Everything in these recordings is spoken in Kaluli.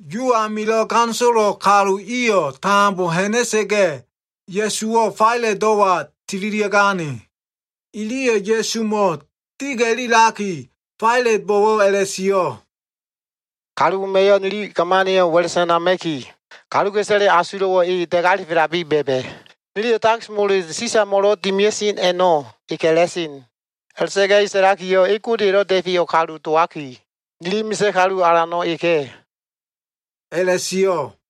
Yu amilo꞉ ganisolo kalu iyo꞉ tambo ha꞉na꞉sa꞉ga꞉, Ya꞉suwo꞉ Failatdo꞉wa tililia꞉gane. Iliyo꞉ Ya꞉sumo꞉ diga꞉lilaki, Failatbo꞉wo꞉ a꞉la꞉sio꞉, “Kalu wema꞉yo꞉ nili gamaniyo꞉ wa꞉la꞉ sanama꞉ki kaluka꞉isaleya꞉ asulo꞉wo꞉ e da꞉galifelabi ba꞉ba꞉. Niliyo꞉ takis mole Sisamo꞉lo꞉ dimia꞉sen a꞉no꞉ e ka꞉la꞉sen. A꞉la꞉ta꞉ga꞉ e sa꞉lakiyo꞉ e Godeya꞉lo꞉ Da꞉feyo꞉ kalu dowaki, nili misa꞉ kalu alano꞉ eka꞉” a꞉la꞉sio꞉.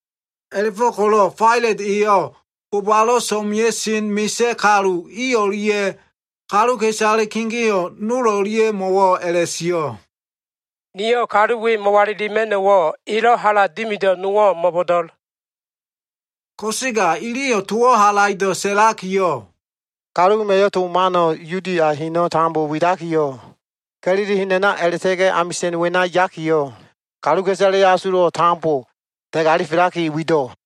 A꞉la꞉fo꞉ko꞉lo꞉ Failat eyo꞉ bobalo꞉ so꞉mea꞉sen misa꞉ kalu i o꞉lia꞉ kaluka꞉isale kegeo꞉ nol o꞉lia꞉mo꞉wo꞉ a꞉la꞉sio꞉, “Niyo꞉ kalu we mo꞉walilima꞉no꞉wo꞉ elo꞉ hala dimido꞉ nowo꞉ mo꞉bo꞉do꞉l.” Ko꞉sega iliyo꞉ towo꞉ halaido꞉ sa꞉lakiyo꞉, “Kalu wema꞉yo꞉ to mano꞉ Yudia heno꞉ tambo widakiyo꞉, Ga꞉lili hen a꞉na a꞉la꞉ta꞉ga꞉ amisa꞉n wena yakiyo꞉ kaluka꞉isaleya꞉ asulo꞉wo꞉ tambo da꞉galifelaki wido꞉.”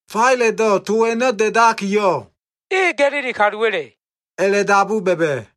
Failatdo꞉ to a꞉no꞉ da꞉dakiyo꞉, “e Ga꞉lili kaluwa꞉le” a꞉la꞉dabu ba꞉ba꞉.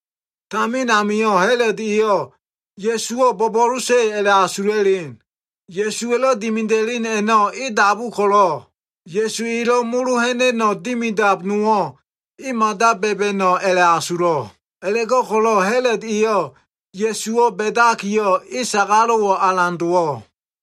Tamin amio꞉ Ha꞉lod eyo꞉ Ya꞉suwo꞉ bo꞉bo꞉losa꞉ a꞉la꞉asula꞉len. Ya꞉suwa꞉lo꞉ dimida꞉len a꞉no꞉ e dabu ko꞉lo꞉, Ya꞉su elo꞉ molo ha꞉na꞉no꞉ dimidab nowo꞉ e mada ba꞉ba꞉no꞉ a꞉la꞉asulo꞉. A꞉la꞉go꞉ko꞉lo꞉ Ha꞉lod eyo꞉ Ya꞉suwo꞉ ba꞉dakiyo꞉, e sagalo꞉wo꞉ alan dowo꞉.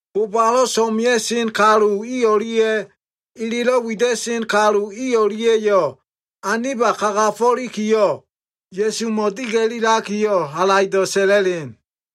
Bobalo꞉ so꞉mea꞉sen misa꞉ kalu i o꞉lia꞉ elelo꞉ wida꞉sen kalu i o꞉lia꞉yo꞉ aniba kagafo꞉likiyo꞉, Ya꞉sumo꞉ diga꞉lilakiyo꞉ halaido꞉ sa꞉la꞉len.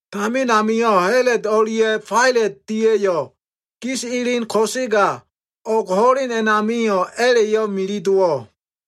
Tamin amio꞉ Ha꞉lod o꞉lia꞉ Failat dia꞉yo꞉ gis elen ko꞉sega o꞉g ho꞉len a꞉namio꞉ a꞉la꞉yo꞉ mili dowo꞉.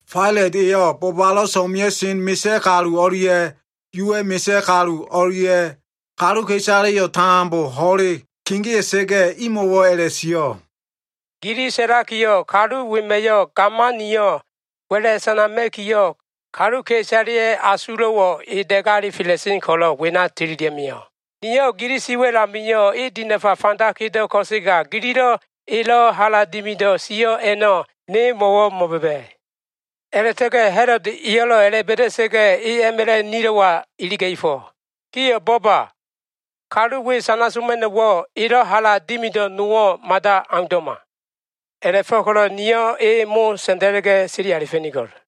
Failat eyo꞉ bobalo꞉ so꞉mea꞉sen misa꞉ kalu o꞉lia꞉ Yuwa꞉ misa꞉ kalu o꞉lia꞉ kaluka꞉isaleyo꞉ tambo ho꞉le kegea꞉sa꞉ga꞉, imo꞉wo꞉ a꞉la꞉sio꞉, “Gili sa꞉lakiyo꞉, kalu wema꞉yo꞉ gamaniyo꞉ wa꞉la꞉ sanama꞉kiyo꞉, kaluka꞉isaleya꞉ asulo꞉wo꞉ e da꞉galifela꞉sen ko꞉lo꞉ wena tililia꞉ mio꞉. Niyo꞉ gili si wa꞉l amio꞉ e dinafa fanda kedo꞉ ko꞉sega gililo꞉ elo꞉ hala dimido꞉ sio꞉ a꞉no꞉ ne mo꞉wo꞉ mo꞉ba꞉ba꞉. A꞉la꞉ta꞉ga꞉ Ha꞉lod eyo꞉lo꞉ a꞉la꞉ba꞉da꞉sa꞉ga꞉, e a꞉ma꞉la꞉ nilo꞉wa iliga꞉fo꞉. Gio꞉ bo꞉ba! Kalu we sana soma꞉no꞉wo꞉, elo꞉ hala dimido꞉ nowo꞉ mada aundo꞉ma. A꞉la꞉fo꞉ko꞉lo꞉ niyo꞉ e sa꞉nda꞉la꞉ga꞉ sili alifa꞉nigo꞉l.”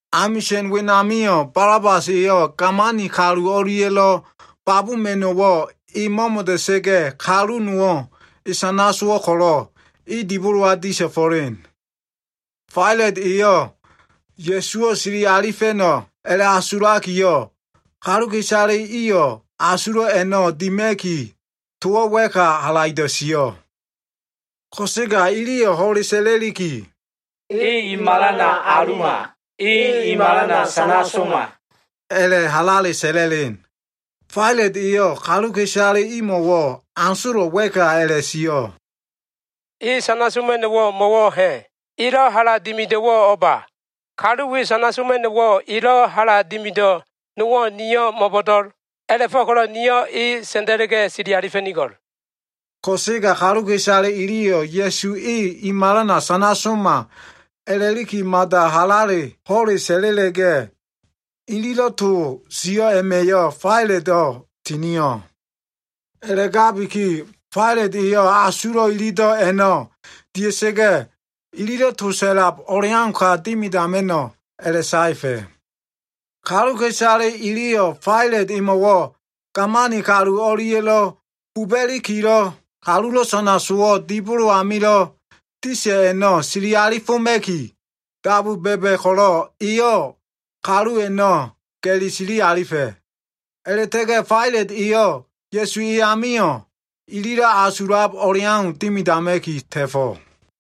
Amisa꞉n wenamio꞉ Balabas eyo꞉ gamani kalu o꞉lia꞉lo꞉ babuma꞉no꞉wo꞉ e mo꞉mo꞉da꞉sa꞉ga꞉, kalu nowo꞉ e sana sowo꞉ ko꞉lo꞉, e dibolowa disalifo꞉len. Failat eyo꞉ Ya꞉suwo꞉ sili alifa꞉no꞉ a꞉la꞉asulakiyo꞉, kaluka꞉isale iyo꞉ asulo꞉ a꞉no꞉ dima꞉ki, towo꞉ wa꞉ka halaido꞉ sio꞉. Ko꞉sega iliyo꞉ ho꞉le sa꞉la꞉liki, “E i malana aluma! E i malana sana soma!” a꞉la꞉ halale sa꞉la꞉len. Failat eyo꞉ kaluka꞉isale imo꞉wo꞉ asolo꞉ wa꞉ka a꞉la꞉sio꞉, “E sana soma꞉no꞉wo꞉ mo꞉wo꞉ ha꞉? Elo꞉ hala dimido꞉wo꞉ o꞉ba? Kalu we sana soma꞉no꞉wo꞉, elo꞉ hala dimido꞉ nowo꞉ niyo꞉ mo꞉bo꞉do꞉l. A꞉la꞉fo꞉ko꞉lo꞉ niyo꞉ e sa꞉nda꞉la꞉ga꞉ sili alifa꞉nigo꞉l.” Ko꞉sega kaluka꞉isale iliyo꞉ Ya꞉su e i malana sana soma a꞉la꞉liki mada halale ho꞉le sa꞉la꞉la꞉ga꞉, ililo꞉ to sio꞉ a꞉ma꞉yo꞉ Failato꞉ tinio꞉. A꞉la꞉gabiki Failat eyo꞉ asulo꞉ ilido꞉ a꞉no꞉ dia꞉sa꞉ga꞉, ililo꞉ to sa꞉lab o꞉leauka dimidama꞉no꞉ a꞉la꞉saefa꞉. Kaluka꞉isale iliyo꞉ Failat emo꞉wo꞉ gamani kalu o꞉lia꞉lo꞉ buba꞉likilo꞉ kalulo꞉ sana sowo꞉ dibolo amilo꞉ disa꞉ a꞉no꞉ sili alifoma꞉ki, dabu ba꞉ba꞉ ko꞉lo꞉, eyo꞉ kalu a꞉no꞉ ga꞉li sili alifa꞉. A꞉la꞉ta꞉ga꞉ Failat eyo꞉ Ya꞉su e amio꞉ ililo꞉ asulab o꞉leau dimidama꞉ki ta꞉fo꞉.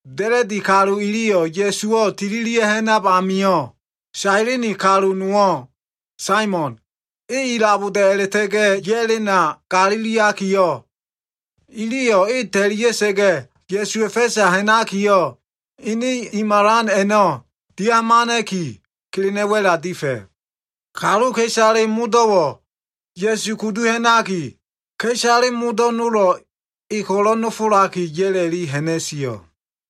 Da꞉la꞉di kalu iliyo꞉ Ya꞉suwo꞉ tililia꞉ ha꞉nab amio꞉, Sailini kalu nowo꞉, Saimon, e ilaboda꞉ a꞉la꞉ta꞉ga꞉ ya꞉lena galiliakiyo꞉, iliyo꞉ e ta꞉lia꞉sa꞉ga꞉, Ya꞉suwa꞉ fa꞉sa ha꞉nakiyo꞉, ene i malan a꞉no꞉ dia꞉hamana꞉ki, kelena꞉ wa꞉la difa꞉. Kaluka꞉isale modo꞉wo꞉ Ya꞉su kudu ha꞉naki, ka꞉isale modo꞉ nolo꞉ e ko꞉lo꞉ nofolaki ya꞉la꞉li ha꞉na꞉sio꞉.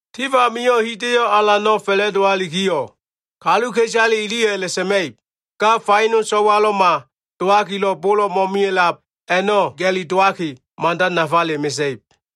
Tif amio꞉ hida꞉yo꞉ alano꞉ fa꞉la꞉dowalikiyo꞉, kaluka꞉isale iliyo꞉ a꞉la꞉sa꞉ma꞉ib, ‘Ga faino, so꞉walo꞉ma dowakilo꞉ bolo꞉ mo꞉mia꞉lab a꞉no꞉ ga꞉li dowaki, mada nafale mesa꞉ib.’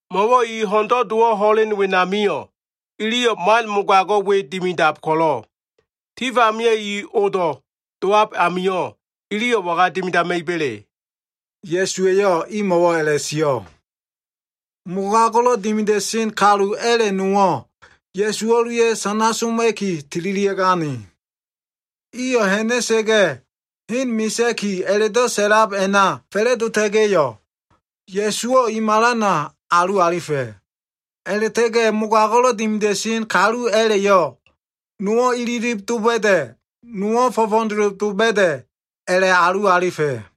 Mo꞉wo꞉ i ho꞉ndo꞉ dowo꞉ ho꞉len wenamio꞉, iliyo꞉ man mogago꞉ we dimidab ko꞉lo꞉, tif amio꞉ i odo꞉ dowab amio꞉, iliyo꞉ waga dimidama꞉iba꞉le?” Ya꞉su eyo꞉ imo꞉wo꞉ a꞉la꞉sio꞉. Mogago꞉lo꞉ dimida꞉sen kalu a꞉la꞉ nowo꞉ Ya꞉su o꞉lia꞉ sana soma꞉ki tililia꞉gane. Iyo꞉ ha꞉na꞉sa꞉ga꞉, Hen Misa꞉ki a꞉la꞉do꞉ sa꞉lab a꞉na fa꞉la꞉dota꞉ga꞉yo꞉, Ya꞉suwo꞉ i malana alu alifa꞉. A꞉la꞉ta꞉ga꞉ mogago꞉lo꞉ dimida꞉sen kalu a꞉la꞉yo꞉, nowo꞉ ililib doba꞉da꞉, nowo꞉ fo꞉fo꞉doloba꞉da꞉ a꞉la꞉alu alifa꞉.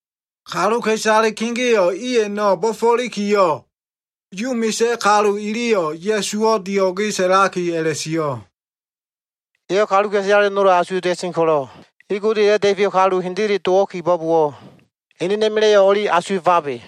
Kaluka꞉isale kegeo꞉ i a꞉no꞉ bo꞉fo꞉likiyo꞉, Yu misa꞉ kalu iliyo꞉ Ya꞉suwo꞉ dio꞉ge sa꞉laki a꞉la꞉sio꞉, “Eyo꞉ kaluka꞉isale nolo꞉ asuwa꞉ta꞉sen ko꞉lo꞉, e Godeya꞉lo꞉ Da꞉feyo꞉ kalu hendele dowo꞉ kibo꞉bowo꞉, enena꞉ma꞉la꞉yo꞉ o꞉li asuwa꞉fabe.”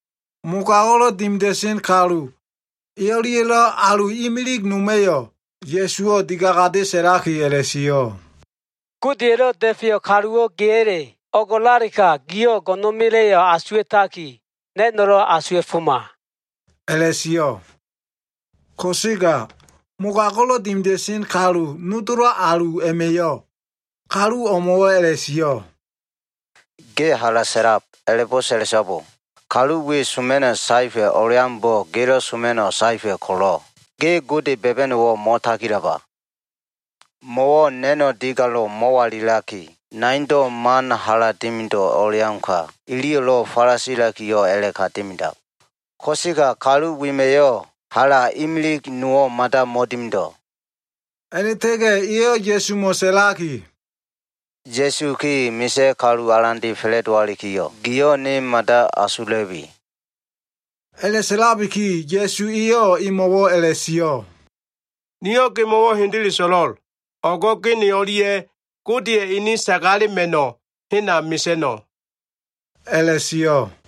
Mogago꞉lo꞉ dimida꞉sen kalu e o꞉lia꞉lo꞉ alu imili noma꞉yo꞉ Ya꞉suwo꞉ digagade sa꞉laki a꞉la꞉sio꞉, “Godeya꞉lo꞉ Da꞉feyo꞉ kaluwo꞉ geya꞉? O꞉ngo꞉lalega giyo꞉ go꞉no꞉na꞉ma꞉la꞉yo꞉ asuwa꞉taki, na꞉no꞉lo꞉ asuwa꞉foma” a꞉la꞉sio꞉. Ko꞉sega mogago꞉lo꞉ dimida꞉sen kalu nodolo꞉ alu a꞉ma꞉yo꞉ kalu o꞉mo꞉wo꞉ a꞉la꞉sio꞉, “Ge hala sa꞉lab. A꞉la꞉bo꞉ sa꞉la꞉so꞉bo! Kalu we soma꞉no꞉ saefa꞉ o꞉leaumbo꞉ gelo꞉ soma꞉no꞉ saefa꞉ ko꞉lo꞉, ge Gode ba꞉ba꞉no꞉wo꞉ mo꞉tagilaba? Mo꞉wo꞉ na꞉no꞉ digalo꞉ mo꞉walilaki, naindo꞉ man hala dimido꞉ o꞉leauka, iliyo꞉lo꞉ falasilakiyo꞉ a꞉la꞉ka dimidab. Ko꞉sega kalu wema꞉yo꞉ hala imilig nowo꞉ mada mo꞉dimido꞉.” A꞉la꞉ta꞉ga꞉ eyo꞉ Ya꞉sumo꞉ sa꞉laki, “Ya꞉su ge misa꞉ kalu alande fa꞉la꞉dowalikiyo꞉, giyo꞉ ne mada asula꞉bi.” A꞉la꞉sa꞉labiki Ya꞉su eyo꞉ emo꞉wo꞉ a꞉la꞉sio꞉, “Niyo꞉ gemo꞉wo꞉ hendele so꞉lo꞉l. O꞉go꞉ ge ne o꞉lia꞉ Godeya꞉ ene sagalema꞉no꞉ hena mesa꞉no꞉” a꞉la꞉sio꞉.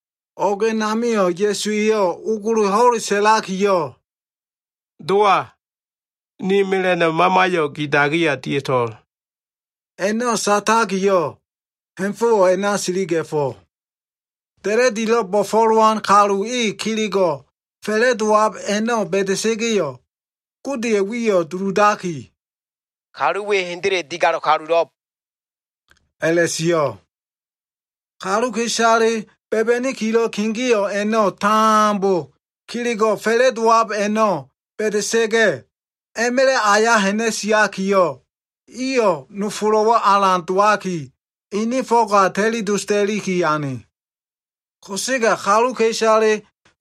O꞉g a꞉namio꞉ Ya꞉su eyo꞉ ogolo ho꞉le sa꞉lakiyo꞉, “Dowa, ni mela꞉no꞉ mamayo꞉ gi dagiya dia꞉to꞉l.” A꞉no꞉ satakiyo꞉, ha꞉fo꞉wo꞉ a꞉na siliga꞉fo꞉. Da꞉la꞉dilo꞉ bo꞉fo꞉lowan kalu e kelego꞉ fa꞉la꞉dowab a꞉no꞉ ba꞉da꞉sa꞉ga꞉yo꞉, Godeya꞉ wiyo꞉ duludaki, “Kalu we hendele digalo꞉ kalulo꞉b” a꞉la꞉sio꞉. Kaluka꞉isale ba꞉ba꞉nikilo꞉ kegeo꞉ a꞉no꞉ tambo kelego꞉ fa꞉la꞉dowab a꞉no꞉ ba꞉da꞉sa꞉ga꞉, a꞉ma꞉la꞉ aya ha꞉na꞉siakiyo꞉, iyo꞉ nofolo꞉wo꞉ alan dowaki ini fo꞉ga ta꞉li dosda꞉li ane. Ko꞉sega kaluka꞉isale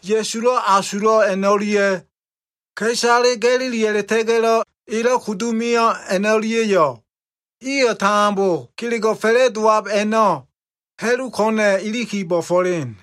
Ya꞉sulo꞉ asulo꞉ a꞉no꞉lia꞉, ka꞉isale Ga꞉lili a꞉la꞉ta꞉ga꞉lo꞉ elo꞉ kudu mio꞉ a꞉no꞉lia꞉yo꞉ iyo꞉ tambo kelego꞉ fa꞉la꞉dowab a꞉no꞉ ha꞉lu ko꞉na꞉ iliki bo꞉fo꞉len.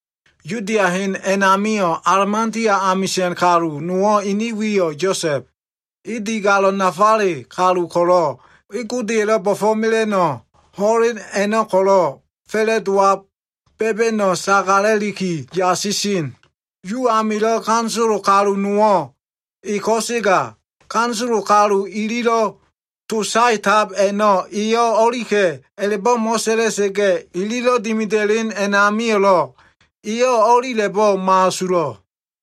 Yudia hen a꞉namilo꞉ Alimatea amisa꞉n kalu nowo꞉ ene wiyo꞉ Yosa꞉b. E digalo꞉ nafale kalu ko꞉lo꞉ e Godeya꞉lo꞉ bo꞉fo꞉mela꞉no꞉ ho꞉len a꞉no꞉ ko꞉lo꞉ fa꞉la꞉dowab ba꞉ba꞉no꞉ sagala꞉liki yasisen. Yu amilo꞉ ganisolo kalu nowo꞉ e ko꞉sega ganisolo kalu ililo꞉ to saetab a꞉no꞉ eyo꞉ o꞉lika꞉ a꞉la꞉bo꞉ mo꞉sa꞉la꞉sa꞉ga꞉, ililo꞉ dimida꞉len a꞉namio꞉lo꞉ eyo꞉ o꞉lila꞉bo꞉ mo꞉asulo꞉.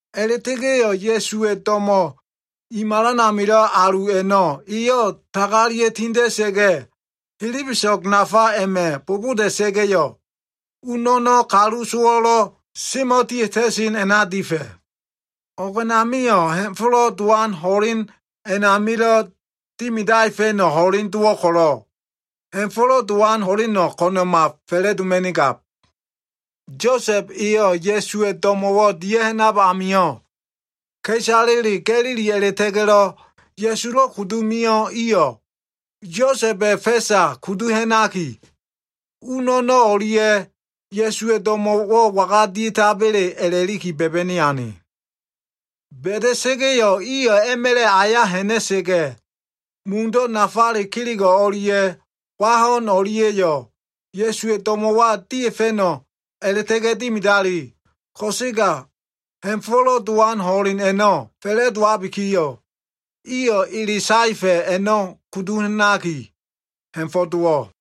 A꞉la꞉ta꞉ga꞉yo꞉ Ya꞉suwa꞉ do꞉mo꞉ i malan amilo꞉ alu a꞉no꞉ eyo꞉ tagalia꞉ tinda꞉sa꞉ga꞉, helebeso꞉g nafale a꞉ma꞉ boboda꞉sa꞉ga꞉yo꞉, u no꞉no꞉ kalu sowo꞉lo꞉ semo꞉dia꞉ta꞉sen a꞉na difa꞉. O꞉g a꞉namio꞉ Ha꞉fo꞉lo꞉ Dowan ho꞉len a꞉namilo꞉ dimidaefa꞉no꞉ ho꞉leno꞉ dowo꞉ ko꞉lo꞉, Ha꞉fo꞉lo꞉ Dowan ho꞉leno꞉ ko꞉na꞉ma fa꞉la꞉doma꞉nigab. Yosa꞉b eyo꞉ Ya꞉suwa꞉ do꞉mo꞉wo꞉ dia꞉ha꞉nab amio꞉, ka꞉isale Ga꞉lili a꞉la꞉ta꞉ga꞉lo꞉ Ya꞉sulo꞉ kudu mio꞉ iyo꞉ Yosa꞉ba꞉ fa꞉sa kudu ha꞉naki, u no꞉no꞉ o꞉lia꞉, Ya꞉suwa꞉ do꞉mo꞉wo꞉ waga dia꞉taba꞉le a꞉la꞉liki ba꞉ba꞉ni ane. Ba꞉da꞉sa꞉ga꞉yo꞉ iyo꞉ a꞉ma꞉la꞉ aya ha꞉na꞉sa꞉ga꞉, mundo꞉ nafa kelego꞉ o꞉lia꞉ wa ho꞉n o꞉lia꞉yo꞉, Ya꞉suwa꞉ do꞉mo꞉wa dia꞉fa꞉no꞉ a꞉la꞉ta꞉ga꞉ dimidali. Ko꞉sega Ha꞉fo꞉lo꞉ Dowan ho꞉len a꞉no꞉ fa꞉la꞉dowabikiyo꞉, iyo꞉ ele saefa꞉ a꞉no꞉ kudu ha꞉naki, ha꞉fo꞉ dowo꞉.